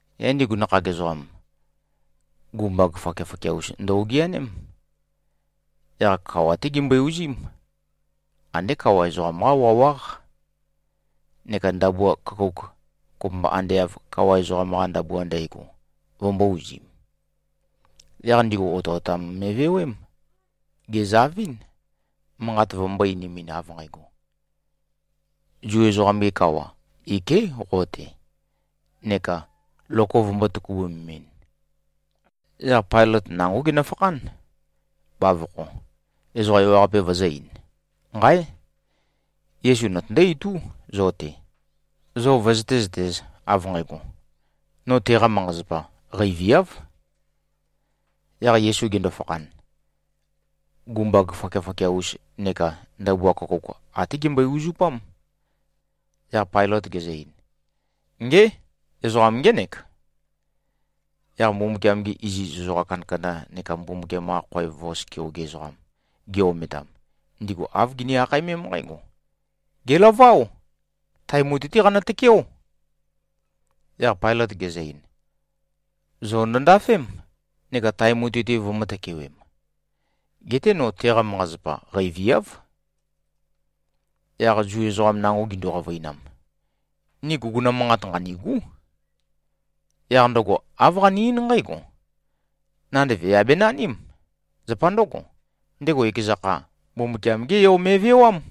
Yaq ndigu nakhag ezoqam, gumbag fakiafakia-us ndø-ogeaném. Yaq kawa-té gimbøe-uzím. Andé kawa ezoqam-qá wawáq. Neka ndabua køkouk, kopømba ande av kawa ezoqam-qa ndabua ndægo, vømbō-uzim. Yaq ndigu otøotam me꞉vewém. Gèzavɨ́n, manqat vømbō-einimin av nqægo, “Zu ezoqam-ge kawa, iké꞉ qo-te,” neka loko vømbō-tøkubømemɨn. Yaq Pailøt nangó genøfakhán, bavokho, ezoqa ewaqape vøzø̄-ein, “Nqáe! Yesu notøndó-itú, zo-te, zo vøzøté-zøtēz, av nqægo, no teqa manqa-zapa qeiviáv.” Yaq Yesu gendo-fakhan, gumbag fakiafakia-us neka ndabua køkouk até gembøe-uzupám. Yaq Pailøt gezø-ein, “Ngé! Ezoqam ngének.” Yaq Mbumbukiam-gi iziz ezoqa kandakanda neka Mbumbukiam-qa khoev vos keoge ezoqam gi-ometam, ndigu āv gini-akhaemém nqǽgo, “Gèlaváo. Tae mutui-té qanø-tøkeó!” Yaq Pailøt gezø-ein, “Zo ndøndafém, neka tae mutui-te vømø̄-tøkewem. Geté no, teqa manqa-zapa qeiviáv.” Yaq Zu ezoqam nango gindu-qavøinam, “Ni guguna manqat nqanîgú. Yaq ndøgo āv qane-eín nqǽgo: Nandev yà benaním. Zapa ndǿgo, ndego ekeza kha, Mbumbukiam-gé yo me꞉vewám.”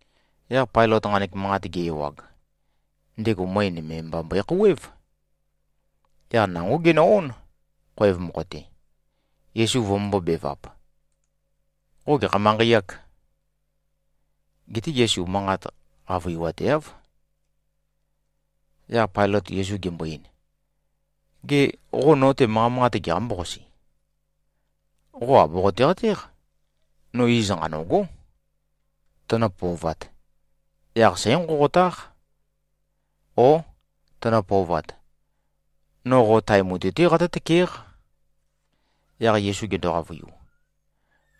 Yaq Pailøt nqanek manqat ge-ewag, ndego møe nøme mba mbøe-khouwév. Yaq nangó genø-ón, khoev mokho-te, Yesu vømømbō-bevap, “Qo gekha manqei-âk?” Geté Yesu manqa qavøiwateáv. Yaq Pailøt Yesu gembo-ein, “Gê, qo no-te manqa manqate geqambó-qasi? Qo àboqote-qatéq? No iz nqanø̂gó. Tønø-pøovat, yaq sǽnqonqotáq. Ó, tønø-pøovat, no qo tae mutui-té qatǿ-tøkéq.” Yaq Yesu gendo-qavøiu,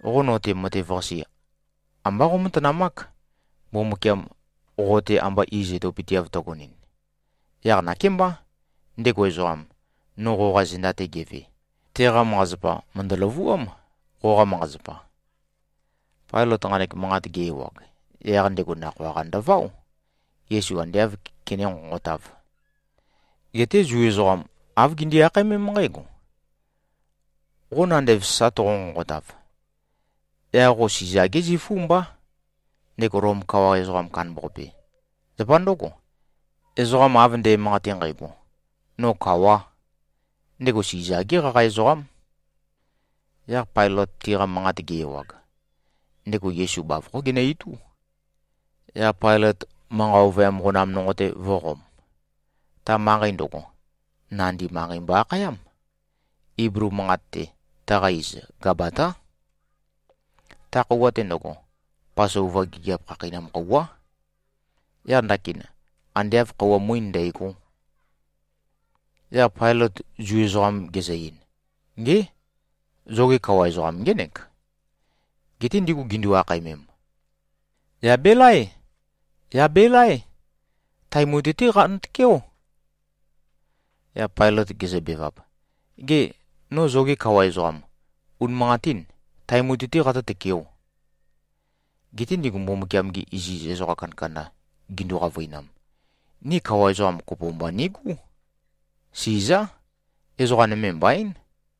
“Qo no-te matev-qase ambá qómatanamák, Mbumbukiam qo-te amba iz etopøteav tøgonɨn. Yaq nakémbá, ndego ezoqam, no qoqa zenda-te geve, teqa manqa-zapa mø̀ndø-løvuám, qoqa manqa-zapa.” Pailøt nqanek manqat ge-ewag, yaq ndego nakhoa-qa ndøváo, Yesu ande āv kené-nqonqotāv. Geté Zu ezoqam, āv gindi-akhaemém nqǽgo, “Qo nandev sa toqo-nqonqotav, yaq qo Siza-gé zifú mbá, ndego Lom kawa ezoqam kandambaqape. Zapa ndǿgo, ezoqa av nde꞉manqate nqægo, no kawā, ndego Siza-gé qaqa ezoqám.” Yaq Pailøt tiqa manqat ge-ewag, ndego Yesu bavokhó genø-itú, yaq Pailøt manqa ovøyam qonam nonqo-te vø̄qom. Ta manqei ndøgo, Nandi Manqei mbo-akhayám. Iblu manqat-te, taqa iz Gabatá. Ta khøuwa-te ndøgo, Pasova gigiap khakheinam khøuwá. Yaq ndakin, ande āv khøuwa muín ndægó. Yaq Pailøt Zu ezoqam gezø-ein, “Ngé! Zoge kawa ezoqam ngének.” Geté ndigu gindu-akhaemem, “Yà belaé. Yà belaé. Tae mutui-té qanø-tøkeó.” Yaq Pailøt gezøbevap, “Gê, no zoge kawa ezoqam, unimanqatín tae mutui-té qatǿ-tøkeō?” Geté ndigu Mbumbukiam-gi iziz ezoqa kandakanda gindu-qavøinam, “Ni kawa ezoqam kopo mba nigú. Sizá. Ezoqa nøme mbaín.”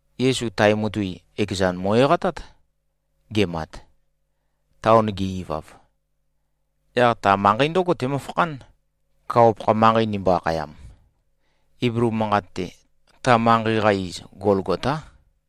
Yesu tae mutui, ekezan mo꞉-eqatát, gemat. Taon ge-ivav, yaq ta manqei ndǿgo temøfakhán, kawa-pakha manqei ndimbo-akhayam. (Iblu manqat-te, ta manqei-qa iz, Golgotá.)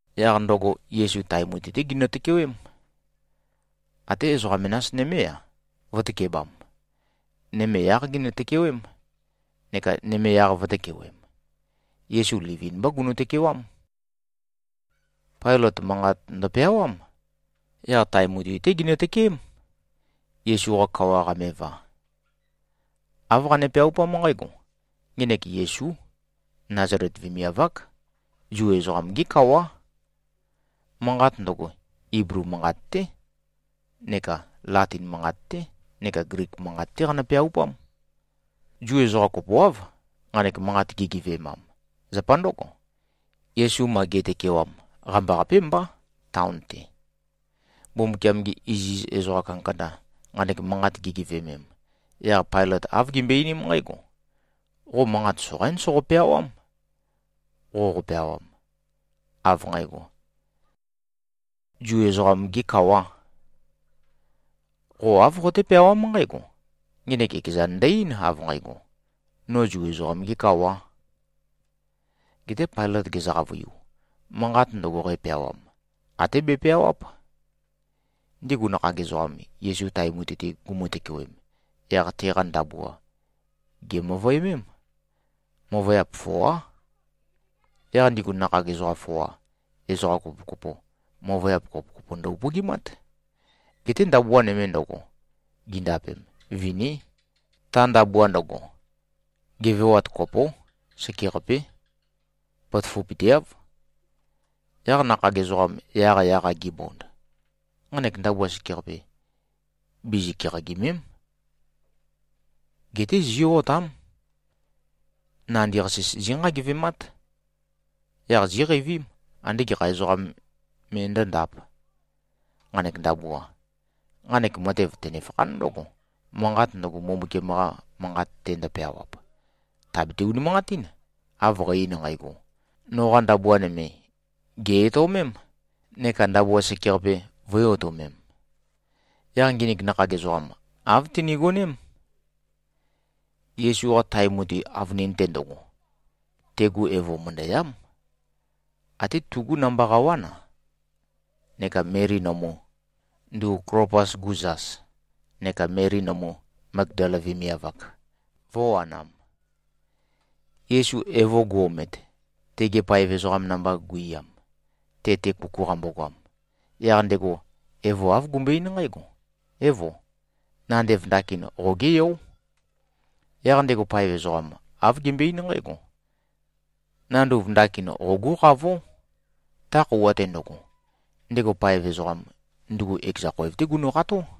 Yaq ndøgo, Yesu tae mutui-té ginø-tøkewém. Até ezoqa menas nømé-a, vø̄tøkebam. Nøme yáq ginø-tøkewém, neka nøme yaq vø̄tøkewem. Yesu livin-mbá gunu꞉-tøkewám. Pailøt manqat ndøpeawám. Yaq tae mutui-té ginø-tøkeém, Yesu-qa kawa qameva. Āv qane-peaupám nqǽgo, “Ngenek Yesú. Nazalet vemiav-ák. Zu ezoqam-gé kawá.” Manqat ndøgo, Iblu manqat-té neka Latin manqat-té neka Glik manqat-té qanø-peaupám. Zu ezoqa kopoáv, nqanek manqat gigeve꞉mam. Zapa ndǿgo, Yesu ma ge꞉tøkewam, qambaqapé mbá, taon-te. Mbumbukiam-gi iziz ezoqa kandakanda, nqanek manqat gigeveømem, yaq Pailøt āv gimbøe-einím nqǽgo, “Qo manqat soqaín soqo-peawám, qoqo-peawam, av nqægo, ‘Zu ezoqam-gē kawā.’ Qo āv qoté-peawám nqǽgo, ‘Ngenek ekezan ndø-eín, av nqægo, no Zu ezoqam-gē kawā.’” Geté Pailøt gezø-qavøiu, “Manqat ndøgo, qæpeawam, até bepeawáp.” Ndigu nakhag ezoqam, Yesu tae mutui-te gumu-tøkewem, yaq teqa ndabua gèmøvøemém. Møvøyap foá. Yaq ndigu nakhag ezoqa foa, ezoqa kopokopo, møvøyap kopokopo ndø-upøgimát. Geté ndabua nøme ndøgo, gindapem, viní. Ta ndabua ndøgo, gevewat kopó. Sekeqapé. Potoføpøteáv. Yaq nakhag ezoqam yaqyaq-a gibond, “Nqanek ndabua sekeqape, bizi-keqagìme᷄m. Geté zí꞉-otám. Nandi-qasis zínqagevemát. Yaq zíqeivím, ande gekha ezoqam me ndǿndāp, nqanek ndabua.” Nqanek matev tønefakhán ndǿgo, manqat ndøgo, Mbumbukiam-qa Manqat-te ndøpeawap, tàbete-unimanqatín, av qæ-ein nqægo, “Noqa ndabua nøme gè-etøomém neka ndabua sekeqape vø̄e-otømem.” Yaq nginik nakhag ezoqam, āv tinigoném. Yesu-qa tae mutui avønin-te ndøgo, tegu evo mø̀ndøyám. Até tugú namba qawán-a, neka Meli nømu, ndugu Klopas-gu zas, neka Meli nømu, Magdala vemiav-ak, vø̄wanam. Yesu evo gu-omet, tege paev ezoqam namba guiyam, te-te kuku qambogoam, yaq ndego evo āv gumbøe-eín nqǽgo, “Évo, nandev ndakin qogé yó.” Yaq ndego paev ezoqam, āv gembøe-eín nqǽgo, “Nanduv ndakin qogú qavó.” Ta khøuwa-te ndøgo, ndego paev ezoqam, ndugu ekeza khoev-té genøkható.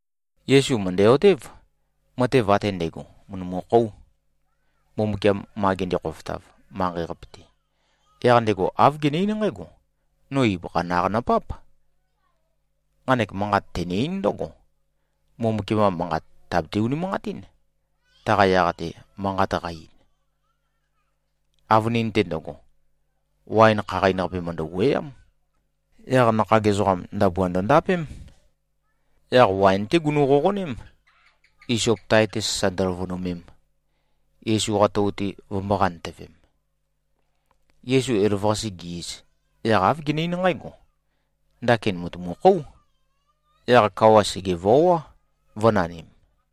Yesu mø̀ndæ-otév, matev ate ndægo mø̀ndømukhóu, Mbumbukiam ma gende-khofotav, manqei-qape-te. Yaq ndego āv gene-eín nqǽgo, “No ibøkha naq nøpáp.” Nqanek manqat tene-eín ndǿgo, Mbumbukiam-qa Manqat tàbete-unimanqatín, taqa yaq-te manqat qa-ein. Avønin-te ndøgo, waen khaqain-qape mø̀ndø-wuøyám. Yaq nakhag ezoqam, ndabua ndøndapém. Yaq waen-té gunu-qoqoném, Isop tae-te sasa ndøløvønemem, Yesu-qa tou-te vømbō-qantøvem. Yesu elavøqase ge-iz, yaq āv gene-eín nqǽgo, “Ndakin mùtumukhóu.” Yaq kawa sègevoá, vø̄nanim.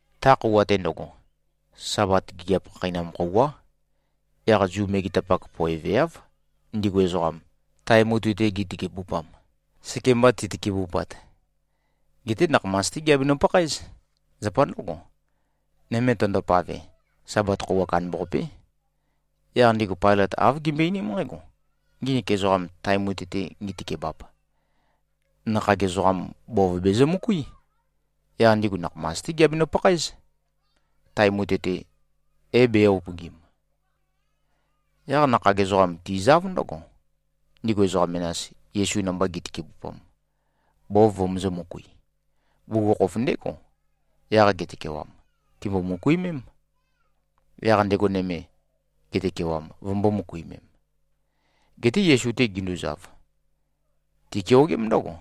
Ta khøuwa-te ndøgo, Sabat gigiap khakheinam khøuwá. Yaq Zu megetapak poeveáv, ndigu ezoqam, tae mutui-te gitøkebupam, sekemba titøkebupat. Geté nakhamas-té giabenø-pakhaéz. Zapa ndǿgo, nøme tøndopave, Sabat khøuwa kandambaqapé. Yaq ndigu Pailøt āv gimbøe-einím nqǽgo, “Nginik ezoqam, tae mutui-te ngitøkebap, nakhag ezoqam bov bezømøkuí. Yaq ndigu nakhamas-té giabenø-pakhaéz, tae mutui-te é-bē-upøgim.” Yaq nakhag ezoqam tizáv ndǿgo, ndigu ezoqa menas, Yesu namba gi꞉tøkebupam, bov vømøzø̄-møkui. Bugukhokhof ndégo, yaq getøkewam, tìmbo-møkuimém, yaq ndego nøme, getøkewam, vømbō-møkuimem. Geté Yesu-te ginduzav, tikeogém ndǿgo,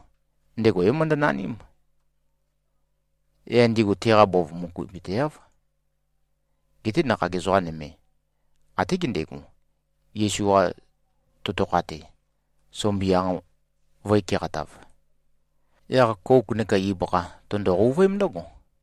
ndego é-møndønaním. Yaq ndigu teqa bov møkuipøteáv. Geté nakhag ezoqa nøme, até gendego, Yesu-qa totokha-te, sumbianq vø̄e-keqatav. Yaq kouk neka ibøkha tøndo-qouvøém ndǿgo.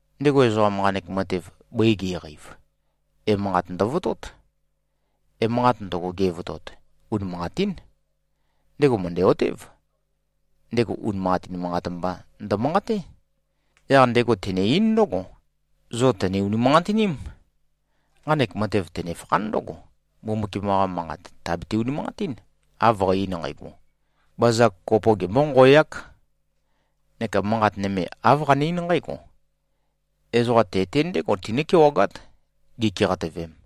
Ndego ezoqam, nqanek matev bøi ge꞉qeiv, emanqat ndøvotót. Emanqat ndøgo, gevotot, unimanqatín. Ndego mø̀ndæ-otév, ndego unimanqatin manqat mba ndømanqaté. Yaq ndego tene-eín ndǿgo, zo tø̀ne-unimanqatiním. Nqanek matev tønefakhán ndǿgo, Mbumbukiam-qa Manqat tàbete-unimanqatín, av qæ-ein nqægo, “Bazag kopo gembónqoeák.” Neka manqat nøme āv qane-eín nqǽgo, “Ezoqa te-te ndégo tinǿ-kewagát, gikeqatøvem.”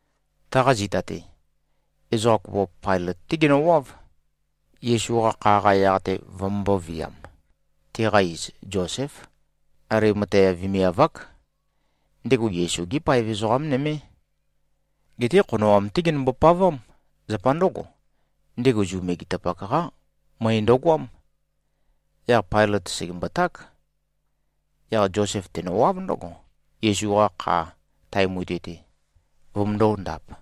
Taqa zita-te, ezoqa kopo Pailøt-té genøwáv, Yesu-qa kha-qa yaq-te vømømbō-viam. Teqa iz Zoséf. Alimatea vemiav-ák. Ndego Yesu-gé paev ezoqá nømé. Geté khonoam-té genømbo-pavám. Zapa ndǿgo, ndego Zu megetapak-qá møe ndøgoám. Yaq Pailøt sègemboták. Yaq Zosef tenøwáv ndǿgo, Yesu-qa kha tae mutui-te vømøndō-ndap.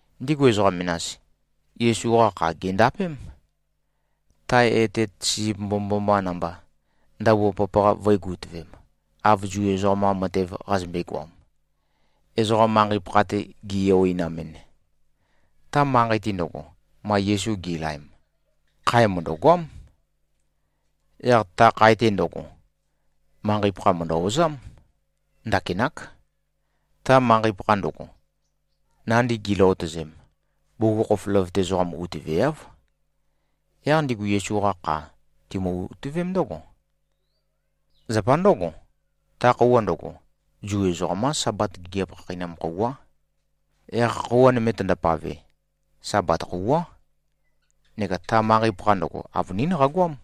Ndigu ezoqa menas, Yesu-qa kha gèndapém, tae etet sisip mbomømboma namba, ndabua papaqa vø̄e-gutøvem, av Zu ezoqam-qa matev qazømbe-goam, ezoqa manqei-pakha-te gi-eoeinamɨn. Ta manqei-te ndøgo, ma Yesu gi꞉laem, khae mø̀ndøgoám. Yaq ta khae-te ndøgo, manqei-pakha mø̀ndø-ozám. Ndakinák. Ta manqei-pakha ndøgo, nandi giløotøzem, bugukhokhof løvøte ezoqa utøveáv. Yaq ndigu Yesu-qa kha timø-utøvém ndǿgo. Zapa ndǿgo, ta khøuwa ndøgo, Zu ezoqam-qá Sabat gigiap khakheinam khøuwá. Yaq khøuwa nøme tøndopave, Sabat khøuwá, neka ta manqei-pakha ndøgo, avønín qagoám.